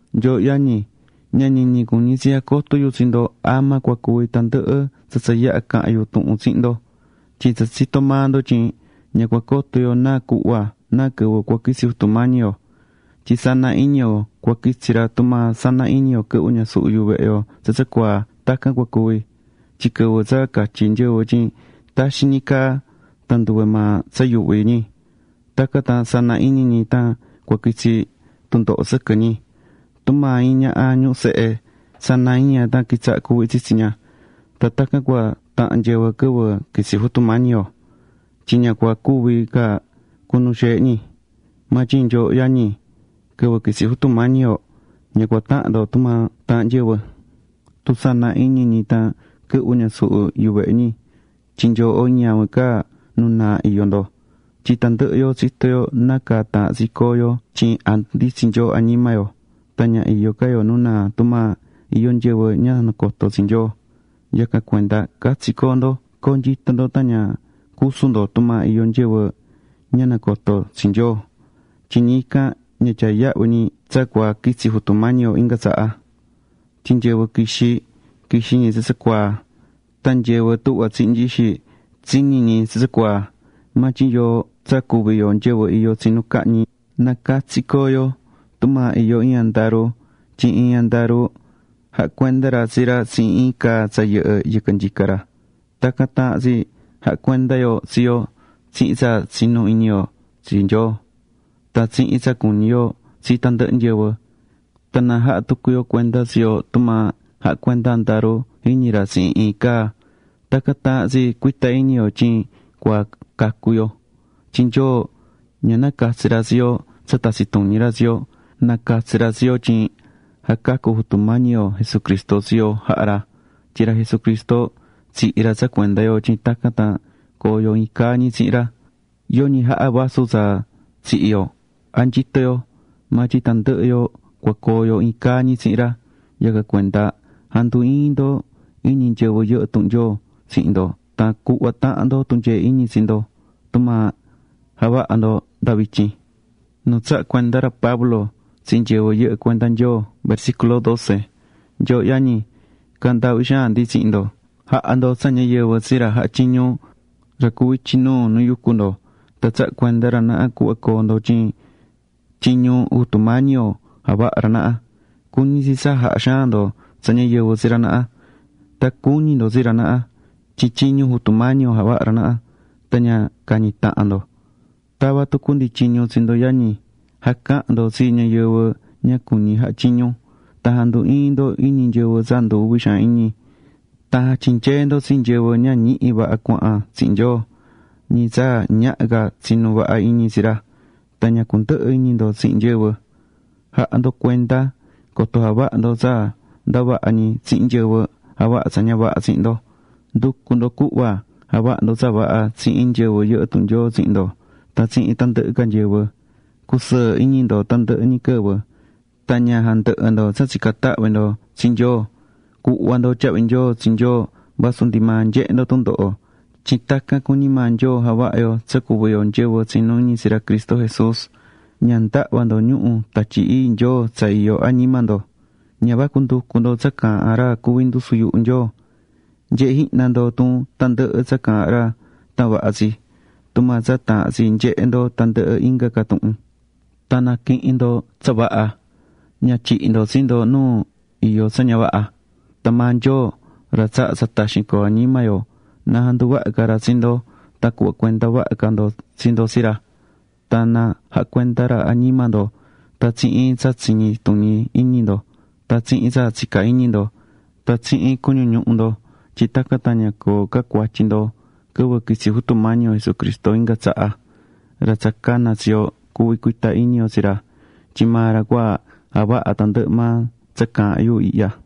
Nyooho yañi, ña ñiñi cuñí tsi jacoto yu tsi ndo ama cua cuvi tandɨhɨ tsa tsa yaha̱ caha̱n yu tuhun tsihin ndo. Tyin tsa tsitó maa ndo tyin ña cua coto yo náa cuhva, náa quɨvɨ cua quitsi Jutu Mañi yo. Tyin sana iñi yo cua quitsi ra tumaa sana iñi yo quɨhvɨ́ ñasuhu yuvehe yo tsa tsacuaa tacan cua cuvi. Tyin quɨvɨ tsa catyí nyɨvɨ tyin taxin ñi caa, tan nduve maa tsa yuuhví ñi, tacan tan sana iñi ñi tan cua quitsi tundoho sɨquɨ ñi. Tumaa iin ñaha ñuhú sehe, sana iñi ña tan quitsahá cuuhví tsitsi ña. Tan tacan cua tahan nyɨvɨ quɨvɨ quitsi Jutu Mañi yo, tyin ña cua cuvi ca cunu xeehe ñi. Maa tyin nyooho yañi, quɨvɨ quitsi Jutu Mañi yo ña cua tahan ndo tumaa taahán nyɨvɨ, tun sana iñi ñi tan quɨhvɨ́ ñasuhu yuvehe ñi tyin nyooho ñavin ca nu naa iyó ndo. Tyin tandɨhɨ yo tsitó yo nácaa taahán tsi coo yo tyin jandunditsín Nyoo añima yo, tan ña iyó ca yo nu naa tumaa iyó nyɨvɨ ña nacotó tsi Nyoo. Yacan cuenda catsi co̱o ndo co̱onyito ndo tan ña cusu ndo tumaa iyó nyɨvɨ ña nacotó tsi Nyoo, tyin ñi ican ña tyaá yahvi ñi tsa cua quitsi Jutu Mañi yo inga tsaha. Tyin nyɨvɨ quixí, quixí ñi tsacuaa, tan nyɨvɨ tuhva tsihí nyixi, tsiñí ñi tsacuaa. Maa tyin yoo tsa cuví yo nyɨvɨ iyó tsinu cahñi, na catsi co̱o yo. Tumaa iyó iin andaru tyin iin andaru jahá cuenda ra tsi ra tsihin iin caa tsa yɨhɨ́ yɨquɨ nyica ra, tacan taahán tsi ja̱ha yo cuenda tsi yo tsihin tsa tsinú iñi yo tsi Nyoo, tan tsihin tsa cuñí yo tsi tandɨhɨ nyɨvɨ. Tan na jaha tucu yo cuenda tsi yo tumaa jahá cuenda andaru jiñi ra tsihin iin caa, tacan taahán tsi cuita iñi yo tyin cua cacu yo. Tyin Nyoo ña nacatsi̱ ra tsi yo tsa tatsi tuñi ra tsi yo, nacatsi̱ ra tsi yo tyin jacacu Jutu Mañi yo Jesucristo tsi yo jaha̱ ra. Tyin ra Jesucristo tsihi̱ ra tsa cuenda yo tyin tacan tan coo yo iin caa ñi tsihin ra. Yoñi jaha vasu tsa tsihi̱ yo, a nyito yo, maa tyin tandɨhɨ yo cua coo yo iin caa ñi tsihin ra. Yacan cuenda ja̱ndu iin ndo iñi nyɨvɨ yɨhɨ́ tuhun Nyoo tsihin ndo tan cuhva tahan ndo tunyee iñi tsi ndo, tumaa javahá ndo nda vityin.Nu tsaha̱ cuenda ra Pablo tsi nyɨvɨ yɨhɨ́ cuenda Nyoo Nyooho yañi, caahán ndaahvi xaan ndi tsihin ndo, ja̱ha ndo tsa ñayɨvɨ tsi ra jahá tyiñu, ra cuví ityi nuu nu yucú ndo. Tan tsahá cuenda ra naha cuhva coo ndo tyin tyiñu Jutu Mañi yo javahá ra naha. Cuñí tsi tsa jaha xaan ndo tsa ñayɨvɨ tsi ra naha. Tan cu̱ñi ndo tsi ra naha. Tyin tyiñu Jutu Mañi yo javahá ra naha. Tan ña cañi tahan ndo. Tavá tucu ndi tyiñu tsi ndo yañi, ja̱cahan ndo tsi nyɨvɨ ña cuñí jaha tyiñu. Tan ja̱ndu iin ndo iñi nyɨvɨ tsa ndu uvi xaan iñi. Tan ja̱tyinyee ndo tsi nyɨvɨ ña ñihi vaha cuahan tsihin Nyoo, ñi tsa ñaha ca tsinu vaha iñi tsi ra. Tan ña cundɨhɨ iñi ndo tsihin nyɨvɨ. Ja̱ha ndo cuenda coto javaha ndo tsa ndavaha ñi tsihin nyɨvɨ javahá tsa ña vaha tsihin ndo. Ndu̱cu ndo cuhva javaha ndo tsa vaha tsihin nyɨvɨ yɨhɨ́ tuhun Nyoo tsihin ndo tan tsihin tandɨhɨ ca nyɨvɨ. Cusɨɨ iñi ndo tandɨhɨ ñi quɨvɨ. Tan ña jandɨhɨ ndo tsa tsicán tahvi ndo tsi Nyoo. Cu̱hva ndo tyahvi nyoo tsi Nyoo vasu ndi maa nyehé ndo tundoho. Tyin tacan cuñí maa Nyoo javaha yo tsa cuví yo nyɨvɨ tsinú iñi tsi ra Cristo Jesús. Ña ndahva ndo ñuhu̱ Tatyi Ii Nyoo tsa iyó añima ndo. Ña vacu nducu ndo tsa caahán ra cuví ndusu yuhu Nyoo. Nye̱he jihna ndo tun tandɨhɨ tsa caahán ra tan vaha tsi tumaa tsa taahán tsi nyehe ndo tandɨhɨ inga ca tuhun. Tan na̱quihin ndo tsa vaha. Ña tyihi ndo tsi ndo nu iyó tsa ña vaha. Tan maa Nyoo, ra tsahá tsa taxin coo añima yo, na janduvaha ca ra tsi ndo tan cuhva cuenda vaha ca ndo tsi ndo tsi ra. Tan na jaha cuenda ra añima ndo tan tsihin tsa tsiñi tuñi iñi ndo tan tsihin tsa tsicá iñi ndo tan tsihin cuñu ñuhu ndo tyin tacan tan ña coo ca cuatyi ndo quɨvɨ quitsi Jutu Mañi yo Jesucristo inga tsaha. Ra tsa cana̱ tsi yo, cuví cuita iñi yo tsi ra, tyin maa ra cua javaha tandɨhɨ maa tsa caahán yu ihya.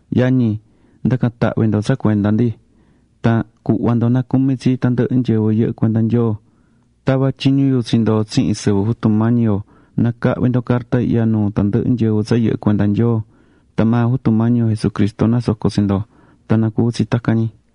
Yañi, nda̱can tahvi ndo tsa cuenda ndi. Tan cu̱hva ndo nacumi tsi tandɨhɨ nyɨvɨ yɨhɨ́ cuenda Nyoo. Tavá tyiñu yu tsi ndo tsihin sɨvɨ Jutu Mañi yo na cahvi ndo carta ihya nuu tandɨhɨ nyɨvɨ tsa yɨhɨ́ cuenda Nyoo. Tan maa Jutu Mañi yo Jesucristo nasoco tsi ndo. Tan na cuvi tsi tacan ñi.